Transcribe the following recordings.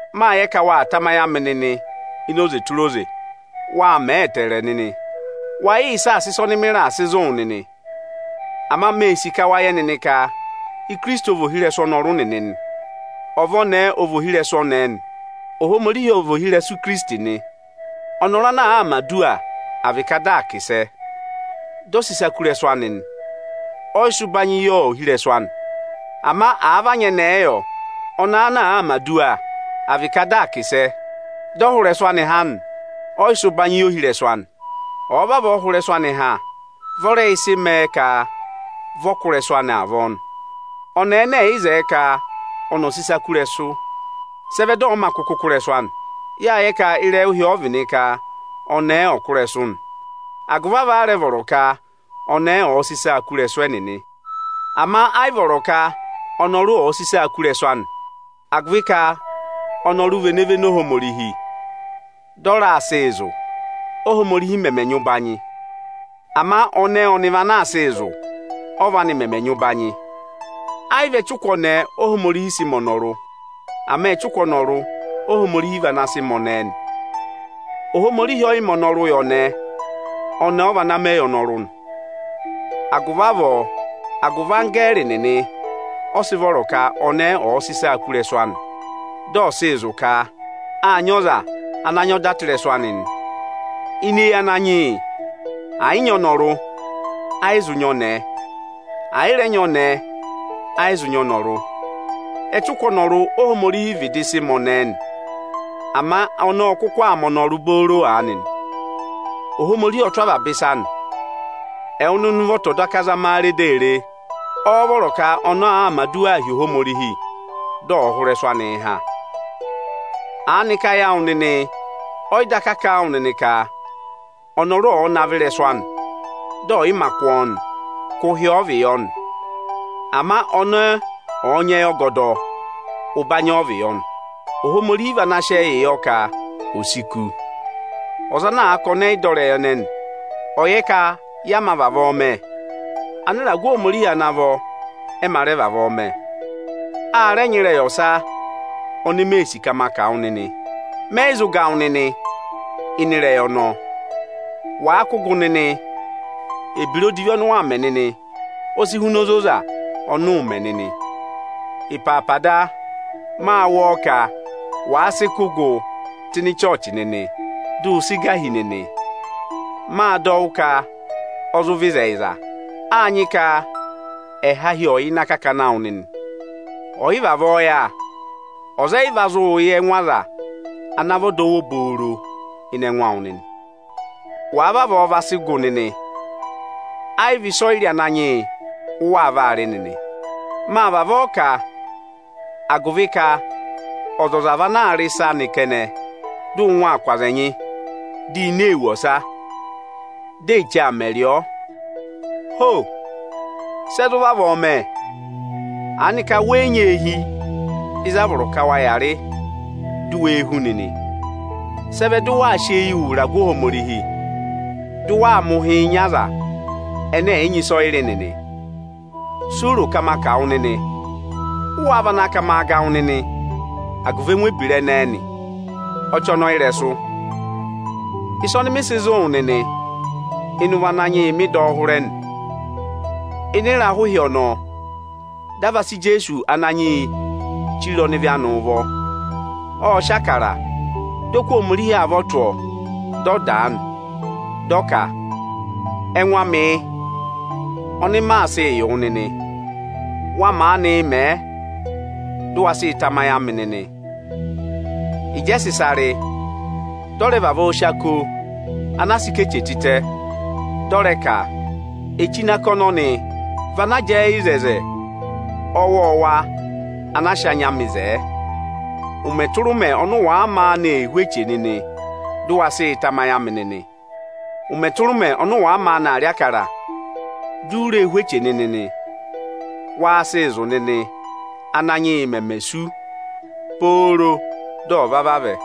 Mâ yẹ ka waa tamayị amị nịnị ini oze tụra oze. Wâ mẹẹ ẹtẹẹrẹ nịnị. Waa yịị saasa ịsa ọnị mị raà sị zụ̀ wụ nịnị. Ama mee sì ka wa yẹ nịnị ka Ikirisiti ọ vị ohirẹsụ ọnọrụ nịnị nị. Ọva ọnẹẹ ọ vị ohirẹsụ ọnẹẹ nị. Ohomorihi ọ vị ohirẹsụ Ikirisiti nị. Ọnọrụ ana àaa mẹ̀ aduwa, à vị ka dị aa kà ịsẹ, dị ọ sị ịsa kú ịrẹsụ anị nị, ọ yị sị ụbanyị yị ohirẹsụ anị. Ama àa vị anyẹnẹẹ yọ, ọnẹẹ ana àaa mẹ̀ aduwa, à vị ka dị aa kà ịsẹ, dị ọ hụ ịrẹsụ anị ha nị, ọ yị sị ụbanyị yị ohirẹsụ anị. Ọ̀ọ vavọọ hụ ịrẹsụ anị ha, vị ọ rẹ yị sị mẹẹ ka vị ọ kụ́ ịrẹsụ anị avọọ nị. Ọnẹẹ ẹnẹ ẹ̀ yị zẹẹ ka ọnị ọ̀ sị ịsa kú ịrẹsụ, sị ẹ vẹ dị ọ̀ọ mā kụkụ kụ́ ịrẹsụ anị? Yâ yẹ ka ịrẹyị ụhị ọ vị nị ka ọnẹẹ ọ̀ọ kụ́ ịrẹsụ nị; agụvị avọọ a rẹ vọrọ ka anẹẹ ọ̀ọ sị ịsaa kụ́ ịrẹsụ ẹnịnị nị! Ama ayị vọrọ ka ọnọrụ ọ̀ sị ịsa kú ịrẹsụ anị, agụvị ka ọnọrụ vị ene véné Ohomorihi, dị ọ raa sịị zụ̀, Óhomorihi mẹmẹ nyị ụbanyị. Ama ọnẹẹ ọnị vị ana aa sịị zụ̀, ọ́va anị mẹmẹ nyị ụbanyị. Ayị vị ẹchụkụ ọnẹẹ Óhomorihi sị mẹ ọnọrụ, ama ẹchụkụ ọnọrụ Óhomorihi vana sị mẹ ọnẹẹ nị. Ohomorihi ọ yị mẹ ọnọrụ yị ọnẹẹ, ọnẹẹ ọ vana mẹ yị ọnọrụ nị. Agụvị avọọ, agụvị anggẹẹrị nịnị ọ sị vọrọ ka ọnẹẹ ọ̀ọ sị ịsaa kú ịrẹsụ anị (dị ọ̀ sị zụ̀ ka â nyị ọza ana nyị ọda tụ́ ịrẹsụ anị) nị. Ini eyi Ananyị yị, ẹ̀ yị nyị ọnọrụ, ẹ yị zụ nyị ọnẹẹ; ẹ̀ yị rẹ nyị ọnẹẹ, ẹ yị zụ nyị ọnọrụ. Ẹchụkụ ọnọrụ Óhomorihi vịdị sị mẹ ọnẹẹ nị, ama ọnẹẹ ọ kụkụ aa ma ọnọrụ booro aanị nị. Ohomorihi ọ tụ́ avaba ịsa nị. Ẹwụ nịnị ụvọta ọ̀ daka zama a re di a re: ọ́ọ́ vọrọ ka ọnẹẹ ọ̀ọ mẹ̀ aduwaa hi Ohomorihi dị ọ̀ hụ ịrẹsụ anị ha? Aanịka ayị awụ nịnị ọ yị daka kà a wụ nịnị ka ọnọrụ ọ̀ọ navọ ịrẹsụ anị, dị ọ̀yị mā kụ́ ọọ nị, ka ụhị ọ vị yọ nị? Ama ọnẹẹ ọ̀ọ nyị ẹyị ọgọdọ, ụbanyị ọ vị yọ nị. Ohomorihi vị ana sị ẹyịị yọ ka ò si kú. Á nyị ọza ana àa ka ọnị ẹ yị dọ ịrẹyị ẹnẹnị, ọ̀ yẹ ka yẹ mā vavọọ mẹ, anịragụ Ohomorihi ana vọ ẹ mā rẹ vavọọ mẹ. A rẹ nyị ịrẹyị ọsa oni mee sì ka ma kà wụ nịnị. Mẹ yị zụ ga wụ nịnị ịnị ịrẹyị ọnọọ. Wàa kụ́ gụ nịnị, ebira odivi ọnị ụ waa mẹ nịnị o si huna ozoza ọnị ụụ̄ mẹ nịnị. Ịpaapa da, mâ wụ́ ọọ ka wàa sị kụ́ gụ tụ́ ịnị ịchọọchị nịnị, dị ụ sị gà hi nịnị. Mâ dọ wụ́ ka ọ zụ vị ịzẹyịza. Â nyị ka ẹhahi ọ̀ yà ịnị akakana awụ nịnị. Ọ̀ yị vavọọ yà, ọza ẹ yị va zụụ yẹ ẹngụ aza ana vị ọdọwụ obooro ịnị ẹngụ awụ nịnị. Wàa vavọọ va sị gụ nịnị, ẹ yị vị ịsọyịrị Ananyị yị ụ waa vaa rị nịnị. Mâ vavọọ kà, agụvị ka ọzọza vị anaā rị ịsa anị kẹnẹ, dị ụngwẹ aa kụ̀ aza ẹnyị, dị ịnẹ ee wù ọsa, dị eche aa mẹ rị ọọ. Ho! Sẹ zụ vavọọ mẹ? Aanịka wẹ yị nyị eehi ịzị a vọrọ ka waa yàa rị, du wee hú nịnị? Sị ẹ vẹ dị ụ waa sị eyii wụ ịragụ Ohomorihi, dị ụ waa mẹ ụhịị nyị aza ẹnẹ ẹ̀ yị nyị ịsọyịrị nịnị? Si u ro ka ma kà wụ nịnị? Ụ waa vana ka maa ga wụ nịnị agụvị ẹngụ ebira ẹnẹẹ nị? Ọchọnọyịrẹsụ! Ịsa ọnị mị sị zụ̀ wụ nịnị, ịnị ụvọ Ananyị yị mị dọ ọ hụrẹ nị. Ịnị ịrahụ ịhị ọnọọ, dị a va sị Ijeesu Ananyị yịị chire ọnịvị anị ụvọ, ộ sị Ịbụrẹẹdị, dị ọ kụ́ Ohomorihi avọ tụ́ ọọ, dị ọ dàa nị, dị ọ ka, “Ẹngụ amị yị, ọnị maa sịị yị wụ nịnị. Wa maanị mẹẹ, dụ wa sịị tamayị amị nịnị!” Ịjị ẹ sị ịsa rị, dị ọ rẹ vavọọ sị ako anaa sị ká eche tịtẹ, dị ọ rẹ ka, “Eche ini ako ọnọnị vị ana jẹẹ yị oto ọwọọwa ana a sị anya amị zẹẹ. Ụmẹ tụra ụmẹ wa maanị ee hú eche ọnọnị nịnị, dị ụ wa sịị tamayị amị nịnị.” Ụmẹ tụra ụmẹ ọnị ụ wàa maanị aa rị Ịbụrẹẹdị, di u ree hú eche ọnọnị nịnị nị, waa sịị zụ̀ nịnị, Ánanyị yị meme sú, pooro dị ọ̀ va vavẹ.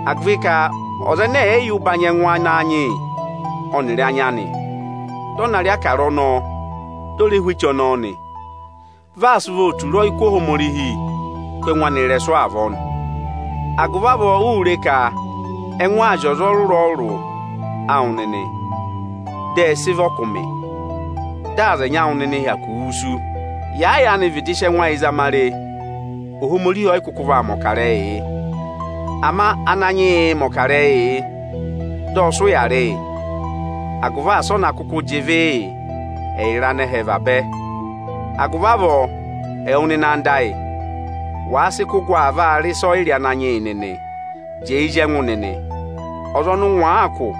Agụvị ka ọza ẹnẹ ẹ̀ yị yẹ ụbanyị ẹngụ Ananyị yị ọnịrị anya anị, dị ọ na rị Ịbụrẹẹdị ọnọọ, di o re hú eche ọnọọ nị, vi aa sị ụvọọ tura ọyịkụ Ohomorihi kú ẹngụ anị ịrẹsụ avọọ nị. Agụvị avọọ, uū re ka ẹngụ aa zị ọza ọrụrụ-ọrụrụ awụ nịnị, dị ẹ sị vị ọkụmị, dị aza ẹnyị awụ nịnị hyakụ wusu nị. Yàa yaanị vịdị sị ẹngụ ayị zama re, Ohomorihi ọ yị kụkụ vaa mẹ̀ ọkarẹyị yị. Ama Ananyị yị mẹ̀ ọkarẹyị yị, dị ọ sị ụya rị yị, agụvị asị ọ na kụkụ jị ịvị yị ẹyịrị anẹhẹ vabẹ. Agụvị avọọ, ẹwụ nịnị ẹyịnyara ayị, wàa sị kụ́ gụ aa vaa rị ịsọyịrị Ananyị yị nịnị, jẹẹ zí ẹngụ nịnị! Ọza ọnị ụngwẹ àaa kụ̀,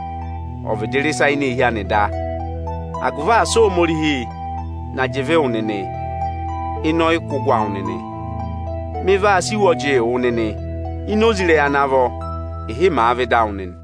ọ̀ vịdị rị ịsa ini eehi anị da, agụvị asị Ohomorihi na jị ịvị wụ nịnị ịnị ọyịkụgụ awụ nịnị! Mị vaa sị iwọjịị wụ nịnị ini oze ịrẹyị ana vọ, ịhị màa vẹ ịdị awụ nịnị.